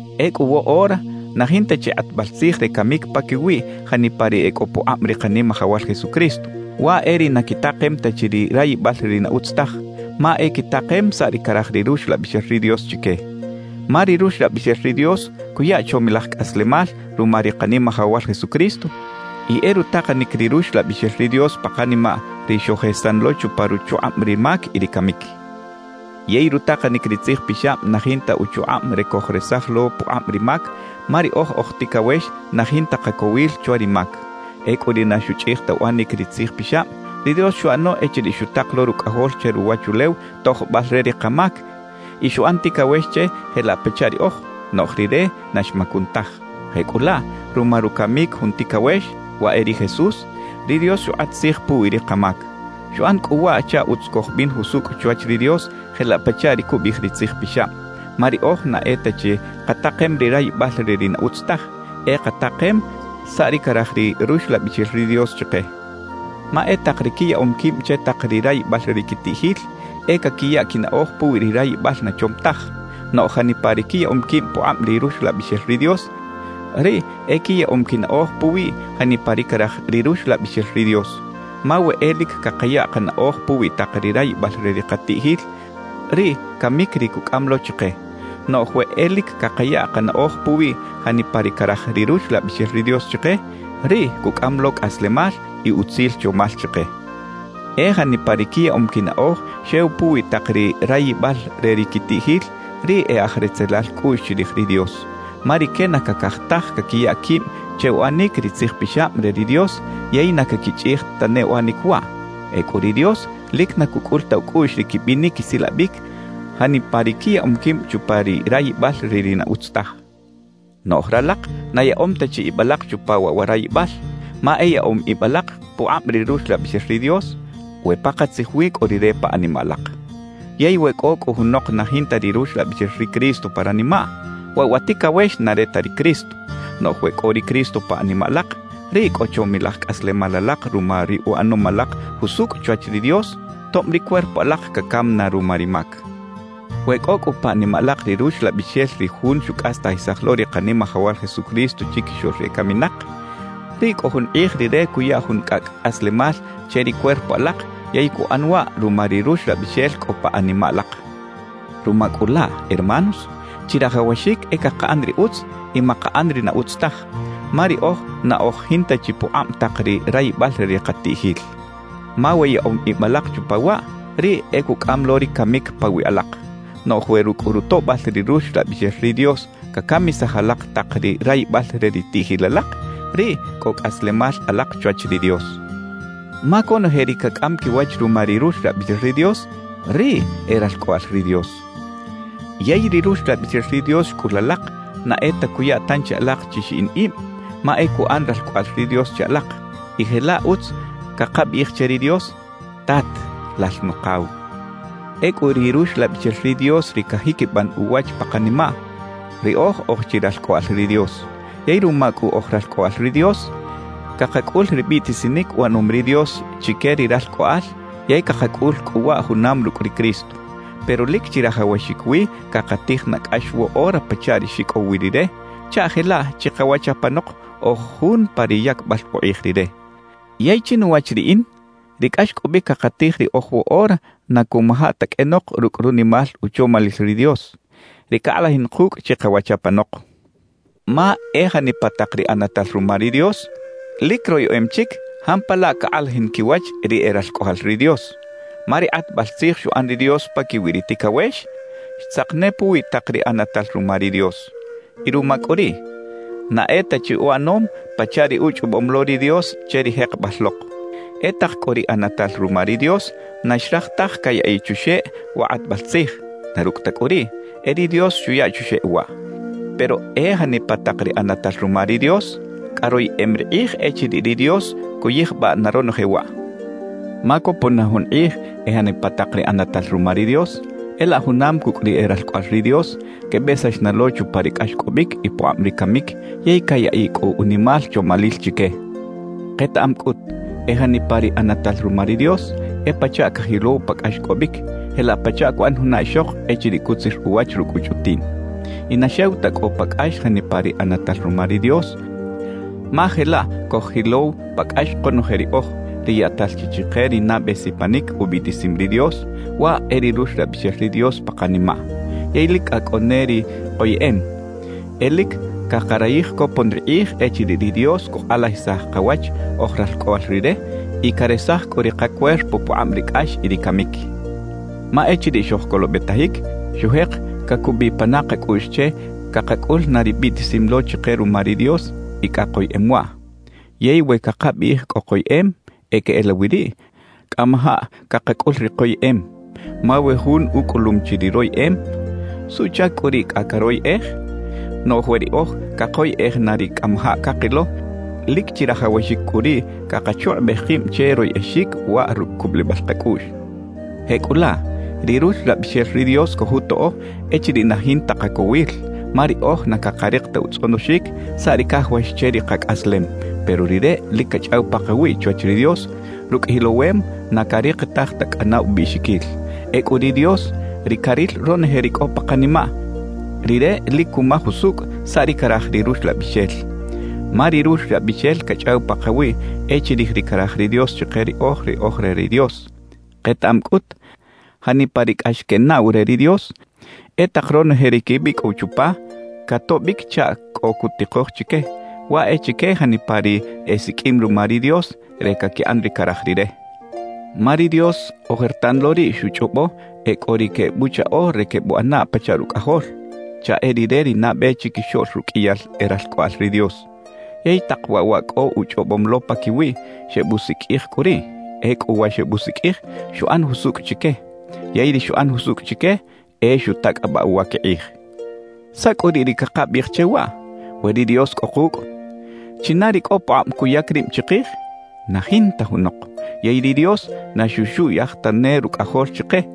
Ecꞌu woꞌora na jinta chi kꞌatbal tzij re camic paquiwi janipa ri e cꞌo pukꞌab ri Kanimajawal Jesucristo; waꞌ e ri na quitakem ta chi ri rayibal re ri na utz taj, ma e quitakem saꞌ ri caraj ri Ruxlabixel ri Dios chique. Ma ri Ruxlabixel ri Dios cuya chomilaj cꞌaslemal ruma ri Kanimajawal Jesucristo, y e rutakanic ri Ruxlabixel ri Dios pa kanimaꞌ ri xojesan lo chupa ruchukꞌab ri mac y ri camic. Yey rutakanic ri Tzij Pixab na jinta uchukꞌab re cojresaj lo pukꞌab ri mac, ma riꞌoj oj ticawex na jinta kacowil chwa ri mac. Ecꞌu ri na xuchꞌij ta uꞌanic ri Tzij Pixab, ri Dios xuꞌano echiriꞌ xutak lo Rucꞌajol che ruwachulew tojbal re ri kamac, y xuꞌan ticawex che jelaꞌ pachaꞌ riꞌoj, noꞌj Rire na xmacun taj. Jecꞌulaꞌ, ruma rucamic jun ticawex, waꞌ e ri Jesús, ri Dios xukꞌat tzij puwi ri kamac. Xuꞌan cꞌu waꞌ chaꞌ utz cojbin jusucꞌ chwach ri Dios jelaꞌ pachaꞌ ri cubiꞌij ri Tzij Pixab; ma riꞌoj na e ta chi katakem ri rayibal re ri na utz taj, e katakem saꞌ ri caraj ri Ruxlabixel ri Dios chike. Ma e tak ri quiyaꞌom quib che tak ri rayibal re ri quitiꞌjil, e caquiya quinaꞌoj puwi ri rayibal na chom taj. Noꞌj janipa ri quiyaꞌom quib pukꞌab ri Ruxlabixel ri Dios, riꞌ e quiyaꞌom quinaꞌoj puwi janipa ri caraj ri Ruxlabixel ri Dios. Ma we e lic cakaya kanaꞌoj puwi tak ri rayibal re ri katiꞌjil, riꞌ camic ri cucꞌam lo chike. Noꞌj we e lic cakaya kanaꞌoj puwi janipa ri caraj ri Ruxlabixel ri Dios chike, riꞌ cucꞌam lo cꞌaslemal y utzil chomal chike. E janipa ri quiyaꞌom quinaꞌoj xew puwi tak ri rayibal re ri quitiꞌjil, riꞌ e aj retzelal cꞌuꞌx chirij ri Dios. Ma rique na cacaj taj caquiya quib che uꞌanic ri Tzij Pixab re ri Dios, yey na caquichꞌij tane uꞌanic waꞌ. Ecꞌu ri Dios lic na cucꞌul ta ucꞌuꞌx ri quibinic quisilabic janipa ri quiyaꞌom quib chupa ri rayibal re ri na utz taj. Noꞌj ralak na yaꞌom ta chi ib alak chupa waꞌ wa rayibal, ma e yaꞌom ib alak pukꞌab ri Ruxlabixel ri Dios, we pakatzij wi cꞌo Rire pa animaꞌ alak. Yey we cꞌo cꞌu junok na jinta ri Ruxlabixel ri Cristo pa ranimaꞌ, waꞌ wa ticawex na re ta ri Cristo. Noꞌj we cꞌo ri Cristo pa animaꞌ alak, riꞌ cꞌo chomilaj cꞌaslemal alak ruma ri uꞌanom alak jusucꞌ chwach ri Dios, tob ri cuerpo alak cacam na ruma ri mac. We cꞌo cꞌu pa animaꞌ alak ri Ruxlabixel ri Jun xucꞌastajisaj lo ri Kanimajawal Jesucristo chiquixoꞌl ri ecaminak, riꞌ cꞌo jun kꞌij Rire cuya jun cꞌacꞌ cꞌaslemal che ri cuerpo alak yey cuꞌan waꞌ ruma ri Ruxlabixel cꞌo pa animaꞌ alak. Ruma cꞌu laꞌ, hermanos, chirajawaxic e cakaꞌan ri utz y makaꞌan ri na utz taj, ma riꞌoj na oj jinta chi pukꞌab tak ri rayibal re ri katiꞌjil. Ma we yaꞌom ib alak chupa waꞌ, riꞌ e cucꞌam lo ri camic pawiꞌ alak. Noꞌj we rucꞌ rutoꞌbal ri Ruxlabixel ri Dios cacamisaj alak tak ri rayibal re ri tiꞌjil alak, riꞌ cꞌo cꞌaslemal alak chwach ri Dios. Ma conoje ri cacꞌam quiwach ruma ri Ruxlabixel ri Dios, riꞌ e ralcꞌoꞌal ri Dios. Yey ri Ruxlabixel ri Dios xcꞌul alak, na e ta cuya tanchi alak chi xiꞌin ib; ma e cuꞌan ralcꞌoꞌal ri Dios che alak, y jelaꞌ utz cakabiꞌij che ri Dios: «¡Tat, Lal Nukaw!» Ecꞌu ri Ruxlabixel ri Dios ri cajiquiban uwach pa kanimaꞌ: Riꞌoj oj chi ralcꞌoꞌal ri Dios. Yey ruma cꞌu oj ralcꞌoꞌal ri Dios, cakacꞌul ri biꞌtisinic uꞌanom ri Dios chique ri ralcꞌoꞌal, yey cakacꞌul cꞌu waꞌ junam rucꞌ ri Cristo. Pero lic chirajawaxic wi cakatij na cꞌax woꞌora pachaꞌ ri xicꞌow wi Rire, chaꞌ jelaꞌ chikawach apanok, oj jun pa ri yacbal ukꞌij Rire. Yey chinuwach riꞌin ri cꞌaxcꞌobic cakatij riꞌoj woꞌora na cuꞌmaja ta qꞌuenok rucꞌ runimal uchomalil ri Dios, ri cakꞌalajin kucꞌ chikawach apanok. Ma e janipa tak ri ꞌanatal ruma ri Dios lic royeꞌem chic jampalaꞌ cakꞌalajin quiwach ri e ralcꞌoꞌal ri Dios. Ma ri kꞌatbal tzij xuꞌan ri Dios paquiwi ri ticawex, xtzak ne puwi tak ri ꞌanatal ruma ri Dios. Y ruma cꞌu riꞌ, na e ta chi uꞌanom pachaꞌ ri uchꞌobom lo ri Dios che ri jekebal lok. E tak cꞌu ri ꞌanatal ruma ri Dios na xraj taj cayaꞌiꞌ chuxeꞌ wa kꞌatbal tzij; na rucꞌ ta cꞌu riꞌ, e ri Dios xuya chuxeꞌ waꞌ. Pero e janipa tak ri ꞌanatal ruma ri Dios, cꞌa royeꞌem ri kꞌij echiriꞌ ri Dios cuyijbaꞌ na ronoje waꞌ. Ma copon na jun kꞌij e janipa tak ri ꞌanatal ruma ri Dios, e laꞌ junam cucꞌ ri e ralcꞌoꞌal ri Dios, quebesax na lo chupa ri cꞌaxcꞌobic y pukꞌab ri camic yey cayaꞌiꞌ cꞌu unimal chomalil chique. Ketaꞌam cꞌut, e janipa ri ꞌanatal ruma ri Dios, e pachaꞌ cajilow pa cꞌaxcꞌobic, jelaꞌ pachaꞌ cuꞌan juna ixok echiriꞌ cutzir uwach rucꞌ uchꞌutiꞌn. Y na xew ta cꞌo pa cꞌax janipa ri ꞌanatal ruma ri Dios, ma jelaꞌ coj-jilow pa cꞌax konoje riꞌoj, ri yaꞌtal chi chike ri nabe sipanic ubiꞌtisim ri Dios, waꞌ e ri Ruxlabixel ri Dios pa kanimaꞌ. Yey lic cꞌa cꞌo ne ri koyeꞌem. E lic cakarayij copon ri kꞌij echiriꞌ ri Dios cukꞌalajisaj kawach oj ralcꞌoꞌal Rire y caresaj cꞌu ri kacuerpo pukꞌab ri cꞌax y ri camic. Ma echiriꞌ xojcolobetajic, xujek cacubiꞌ pana kacꞌuꞌx che cakacꞌul na ri biꞌtisim lo chike ruma ri Dios y cꞌa koyeꞌem waꞌ. Yey we cakabiꞌij cꞌo koyeꞌem, e queꞌelawi riꞌ cꞌamajaꞌ cakacꞌul ri koyeꞌem. Ma we jun ucꞌulum chi ri royeꞌem, ¿suꞌchac cꞌu riꞌ cꞌa caroyꞌej? Noꞌj we riꞌoj cakoyꞌej na ri cꞌamajaꞌ cakilo, lic chirajawaxic cꞌu riꞌ cakachukꞌubej kib che royꞌexic waꞌ rucꞌ cubulibal kacꞌuꞌx. Jecꞌulaꞌ, ri Ruxlabixel ri Dios cojutoꞌo echiriꞌ na jinta kacowil, ma riꞌoj na cakarik ta utzꞌonoxic saꞌ ri cajawax che ri kacꞌaslem; pero Rire lic cachꞌaw pakawiꞌ chwach ri Dios rucꞌ jilowem na carikitaj ta cꞌana ubiꞌxiquil. Ecꞌu ri Dios, ri caril ronoje ri cꞌo pa kanimaꞌ, Rire lic cumaj usucꞌ saꞌ ri caraj ri Ruxlabixel, ma ri Ruxlabixel cachꞌaw pakawiꞌ e chirij ri caraj ri Dios chike riꞌoj ri oj re ri Dios. Ketaꞌam cꞌut, janipa ri cꞌax quenaꞌw re ri Dios, e tak ronoje ri quebicꞌow chupa catoꞌbic chaꞌ cꞌo cutikoj chique, waꞌ e chique janipa ri esiqꞌuim ruma ri Dios re caquiꞌan ri caraj Rire. Ma ri Dios ojertan lo riꞌ xuchꞌobo e cꞌo ri quebuchaꞌo re quebuꞌana pachaꞌ Rucꞌajol, chaꞌ e Rire ri nabe chiquixoꞌl ruqꞌuiyal e ralcꞌoꞌal ri Dios. Yey tak waꞌ wa cꞌo uchꞌobom lo paquiwiꞌ, xebusiqꞌuij cꞌu riꞌ. Ecꞌu wa xebusiqꞌuij, xuꞌan jusucꞌ chique. Yey ri xuꞌan jusucꞌ chique, e xutacꞌabaꞌ uwa quikꞌij. ¿Saꞌ cꞌu riꞌ ri cakabiꞌij che waꞌ? We ri Dios cꞌo kucꞌ, ¿china ri cꞌo pukꞌab cuyac rib chikij? ¡Na jinta junok! Yey ri Dios na xuxuꞌyaj tane Rucꞌajol chike,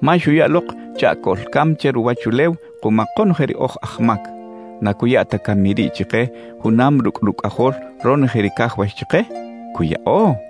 ma xuya lok chaꞌ coꞌlcam che ruwachulew kuma konoje ri oj aj mac. ¿Na cuya ta cami riꞌ chike junam rucꞌ Rucꞌajol, ronoje ri cajawax chike? ¡Cuyaꞌo!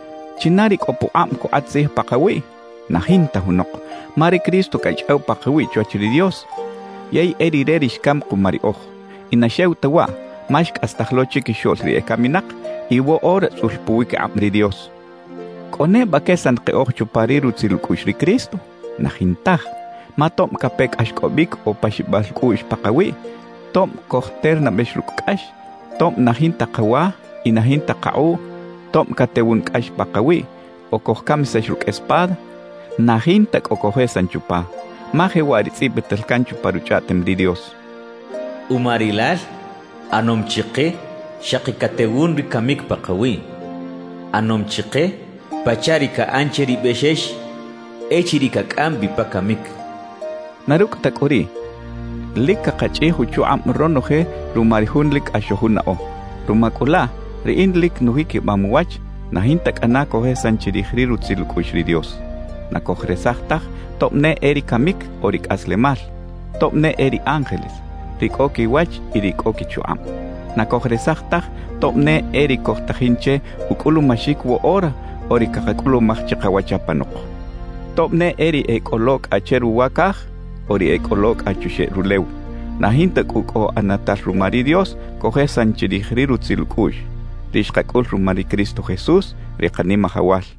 ¿China ri cꞌo pukꞌab cukꞌat tzij pakawiꞌ? ¡Na jinta junok! Ma ri Cristo cachꞌaw pakawiꞌ chwach ri Dios, yey e Rire ri xcam kuma riꞌoj. Y na xew ta waꞌ, ma xcꞌastaj lo chiquixoꞌl ri ecaminak y woꞌora tzꞌul puwiquikꞌab ri Dios. ¿Cꞌo neba quesan keꞌoj chupa ri rutzil ucꞌuꞌx ri Cristo? ¡Na jintaj! Ma tob cape cꞌaxcꞌobic o paxibal cꞌuꞌx pakawiꞌ, tob cojternabex rucꞌ cꞌax, tob na jinta kawa y na jinta kakꞌuꞌ, tob catewun cꞌax pakawiꞌ o cojcamisax rucꞌ espada, ¡na jinta cꞌo cojesan chupa! Ma jewaꞌ ri tzꞌibital can pa Ruchꞌaꞌtem ri Dios: Uma Rilal ꞌanom chike xaki catewun ri camic pakawiꞌ; ꞌAnom chike pachaꞌ ri caꞌan che ri bexex echiriꞌ cacꞌam bi pa camic cachaꞌ. Na rucꞌ ta cꞌu riꞌ, lic cakachꞌij uchukꞌab ronoje ruma ri Jun lic cꞌax xojunaꞌo. Ruma cꞌu laꞌ, riꞌin lic nujiquibam uwach na jinta cꞌana cojesan chirij ri rutzil ucꞌuꞌx ri Dios. Na cojresaj taj tob ne e ri camic o ri cꞌaslemal, tob ne e ri ángeles, ri cꞌo quiwach y ri cꞌo quichukꞌab. Na cojresaj taj tob ne e ri cojtajin che ucꞌulumaxic woꞌora o ri cakacꞌulumaj chikawach apanok, tob ne e ri e cꞌo lo cꞌa che ruwa caj o ri e cꞌo lo cꞌa chuxeꞌ rulew. Na jinta cꞌu cꞌo ꞌanatal ruma ri Dios cojesan chirij ri rutzil ucꞌuꞌx, ri xkacꞌul ruma ri Cristo Jesús, ri Kanimajawal.